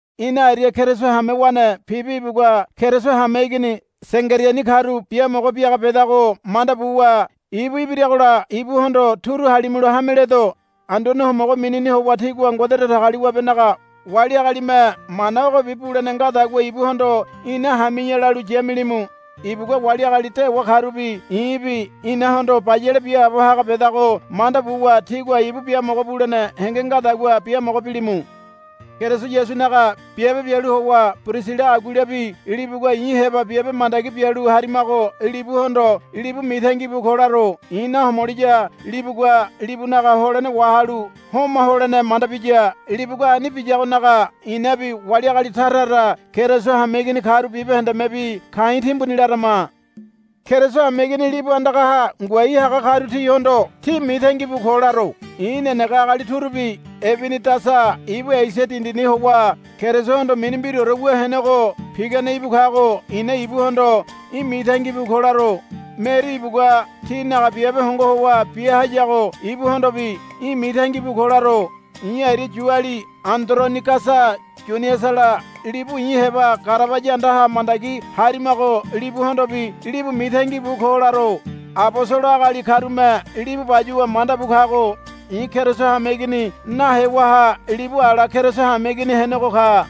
Ina aria Keriso hamewane Pibi ibugua Keriso hameigini Sengeriani karu biamogo biaga bedago manda buwa ibu ibiragola ibuhondo turu halimulo hameledo. Anduane Homogo minini howa tígua Ngode Datagaliwabenaga wali agalime mana ogobi bulene ngadagua ibuhondo, Ina hami̱ya̱, lalu yamilimu. Ibugua wali agali dewa karubi i̱bi inahondo bayale biaabo haga bedago manda buwa tígua ibu biamogo bulene henge ngadagua biamogo bilimu. Keriso Yasunaga biabe bialu howa Pirisila Aguilabi libugua i̱ heba biabe mandagi bialu harimago libuhondo, Libu mitangi bu ko, laro. I̱ nahomoliya libugua libunaga holene wahalu homa holene manda biya. Libugua ani biyagonaga i̱nabi wali agali tara tara Keriso hameigini karu bibahendemebi ka̱i̱ timbuni larama. Keriso hameigini libu andagaha ngoai haga karu tihondo, Tí mitangi bu ko, laro. I̱ nenege agali turubi Ebinidasa ibu Esia dindini howa Kerisohondo mini mbiraore wu henego pigane ibu kago i̱na ibuhondo, Í̠ mitangi bu ko, laro. Meri ibugua tínaga biabe hongo howa bia hayago ibuhondobi, Í̠ mitangi bu ko, laro. I̱ aria Yuali Andoronigasa Yuniasala libu i̱ heba garabaya andaha mandagi harimago libuhondobi, Libu mitangi bu ko, laro. Abosolo agali karume libu bayuwa manda bu kago. I̱ Keriso hameigini nahewaha libu ala Keriso hameigini henego ka.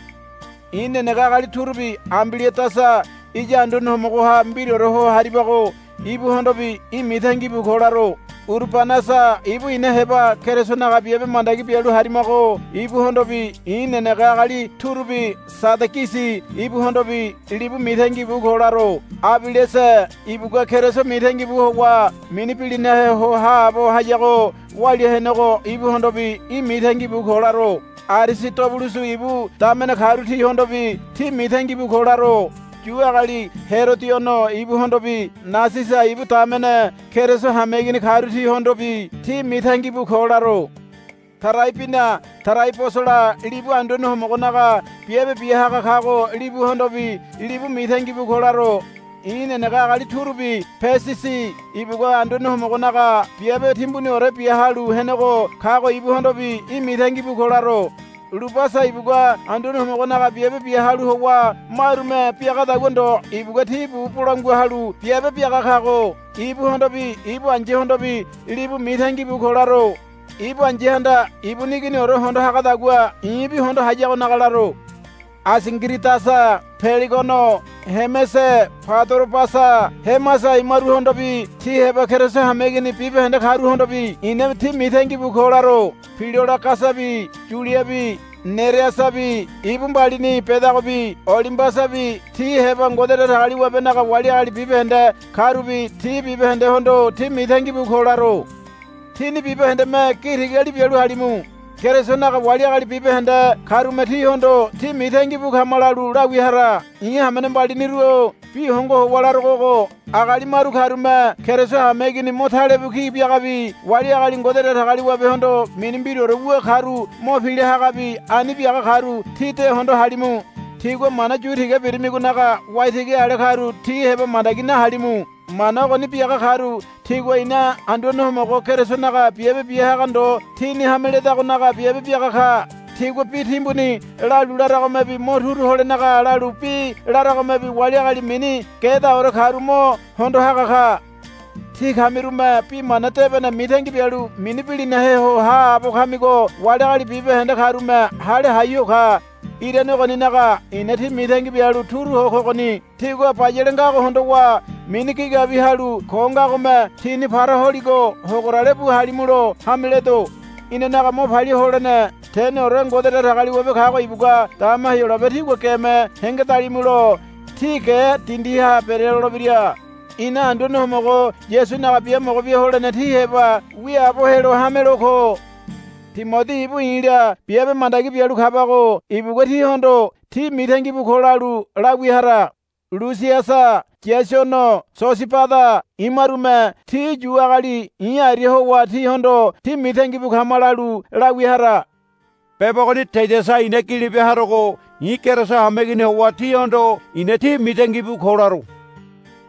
I̱ nenege agali turubi Ambiliadasa iya Anduane Homogoha mbiraore ho haribago ibuhondobi, Í̠ mitangi bu ko, laro. Urubanasa ibu ina heba Kerisonaga biabe mandagi bialu harimago ibuhondobi i̱ nenege agali turubi Sadagisi ibuhondobi, Libu mitangi bu ko, laro. Abelese ibugua Keriso mitangi bu howa mini bilinahe ho haabo hayago walia henego ibuhondobi, Í̠ mitangi bu ko, laro. Arisidobulusu ibu damene karu tihondobi, Tí mitangi bu ko, laro. Yu agali Herodiono ibuhondobi Nasisa ibu damene Keriso hameigini karu tihondobi, Tí mitangi bu ko, laro. Taraibina Taraibosala libu Anduane Homogonaga biabe bia haga kago libuhondobi, Libu mitangi bu ko, laro. I̱ nenege agali turubi Pesisi ibugua Anduane Homogonaga biabe timbuniore bia halu henego kago ibuhondobi, Í̠ mitangi bu ko, laro. Lubasa ibugua Anduane Homogonaga biabe bia halu howa marume biagadagua ndo ibugua ti bu bolangua halu biabe biaga kago ibuhondobi ibu ai̱yahondobi, Libu mitangi bu ko, laro. Ibu ai̱yahanda ibuni iginiore hondo hagadagua i̱bi hondo hayagonaga laro. Asingiridasa Pelegono Hemese Padorobasa Hemasa imaruhondobi ti heba Keriso hameigini bibahende karuhondobi i̱na, Tí mitangi bu ko, laro. Pilologasabi Yuliabi Nereasabi ibu mbalini bedagobi Olimbasabi ti heba Ngode Datagaliwabenaga wali agali bibahende karubi ti bibahendehondo, Tí mitangi bu ko, laro. Tíni bibahendeme gi tigali bialu halimu. Kerisonaga wali agali bibahende karume tíhondo, Tí mitangi bu kama, lalu lawia hara. I̱ hamene mbaliniru-o bi hongo howa larogo ogo. Agali maru karume Keriso hameigini mo talebu ki biagabi wali agali Ngode Datagaliwabehondo mini mbiraore wu karu mo pila hagabi ani biaga karu tí de hondo halimu. Tígua mana yu tiga birimigonaga waitigi ale karu ti heba mandagi nahalimu. Mana ogoni biaga karu tigua ina Anduane Homogo Kerisonaga biabe bia haga ndo tini hame ledagonaga biabe biaga ka. Tigua bi timbuni lalu laragomebi mo turu holenaga lalu bi laragomebi wali agali mini gedaore karu mo hondo haga ka. Tí kamirume Bi Mana Debene mitangi bialu mini bilinahe ho haabo kamigo wali agali bibahende karume hale hai ho ka. Irane ogoninaga i̱na tí mitangi bialu turu ho kogoni. Tígua bayale ngago hondowa mini gigabiwi halu ko ngagome tíni para holigo hogorale bu halimulo hame ledo. Inanaga mo palia holene teneore Ngode Datagaliwabe kago ibugua dama Heyolabe tígua geme hengedalimulo tí ge dindiha berelolebira. Ina Anduane Homogo Yasunaga biamogo bia holene tí heba wiaabo helo hamelo ko. Timodi ibu i̱la biabe mandagi bialu kabago ibugua tíhondo, Tí mitangi bu ko, lalu lawia hara. Lusiasa Yaisono Sosibada imarume ti Yu agali i̱ aria howa tíhondo, Tí mitangi bu kama, lalu lawia hara. Beba ogoni Tediasa i̱na gili bia harogo i̱ Keriso hameigini howa tíhondo, I̱na tí mitangi bu ko, laro.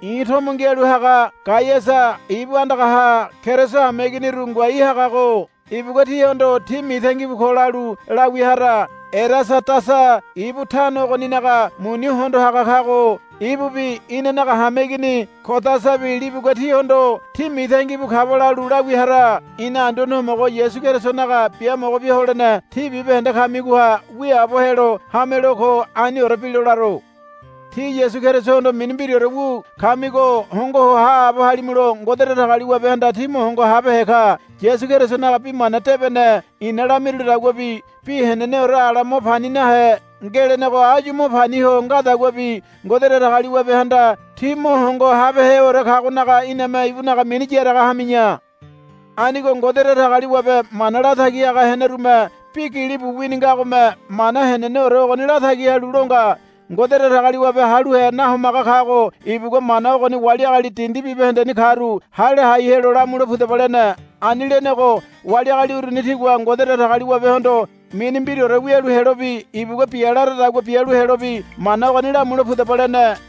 I̱ tomo ngialu haga Gaiasa ibu andagaha Keriso hameiginiru ngoai hagago ibugua tíhondo, Tí mitangi bu ko, lalu lawia hara. Erasadasa ibu tano ogoninaga muni hondo haga kago ibubi inanaga hameigini Kodasabi libugua tíhondo. Tí mitangi bu kaba, lalu lawia hara. [ Ina Anduane Homogo Yasu Kerisonaga biamogo bia holene tí bibahende kamigoha wiaabo helo hamelo ko. Aniore bilo laro.] Tí Yasu Kerisohondo mini mbiraore wu kamigo hongo ho haabo halimulo Ngode Datagaliwabehanda tí mo hongo habehe ka. Yasu Kerisonaga Bi Mana Debene i̱na lamirulidaguabi bi heneneore ala mo pani nahe ngelenego áyu mo pani ho ngadaguabi Ngode Datagaliwabehanda tí mo hongo habeheore kagonaga iname ibunaga mini yaraga hami̱ya. Anigo Ngode Datagaliwabe mana latagi haga henerume bi gilibu wini ngagome mana heneneore ogoni latagi halu lo nga. Ngode Datagaliwabe haluhe nahomaga kago ibugua mana ogoni wali agali dindi bibahendeni karu hale hai helo lamule pudaba lene. Ani lenego wali agali uruni tigua Ngode Datagaliwabehondo mini mbiraore wialu helobi ibugua bia laradagua bialu helobi mana ogoni lamule pudaba lene.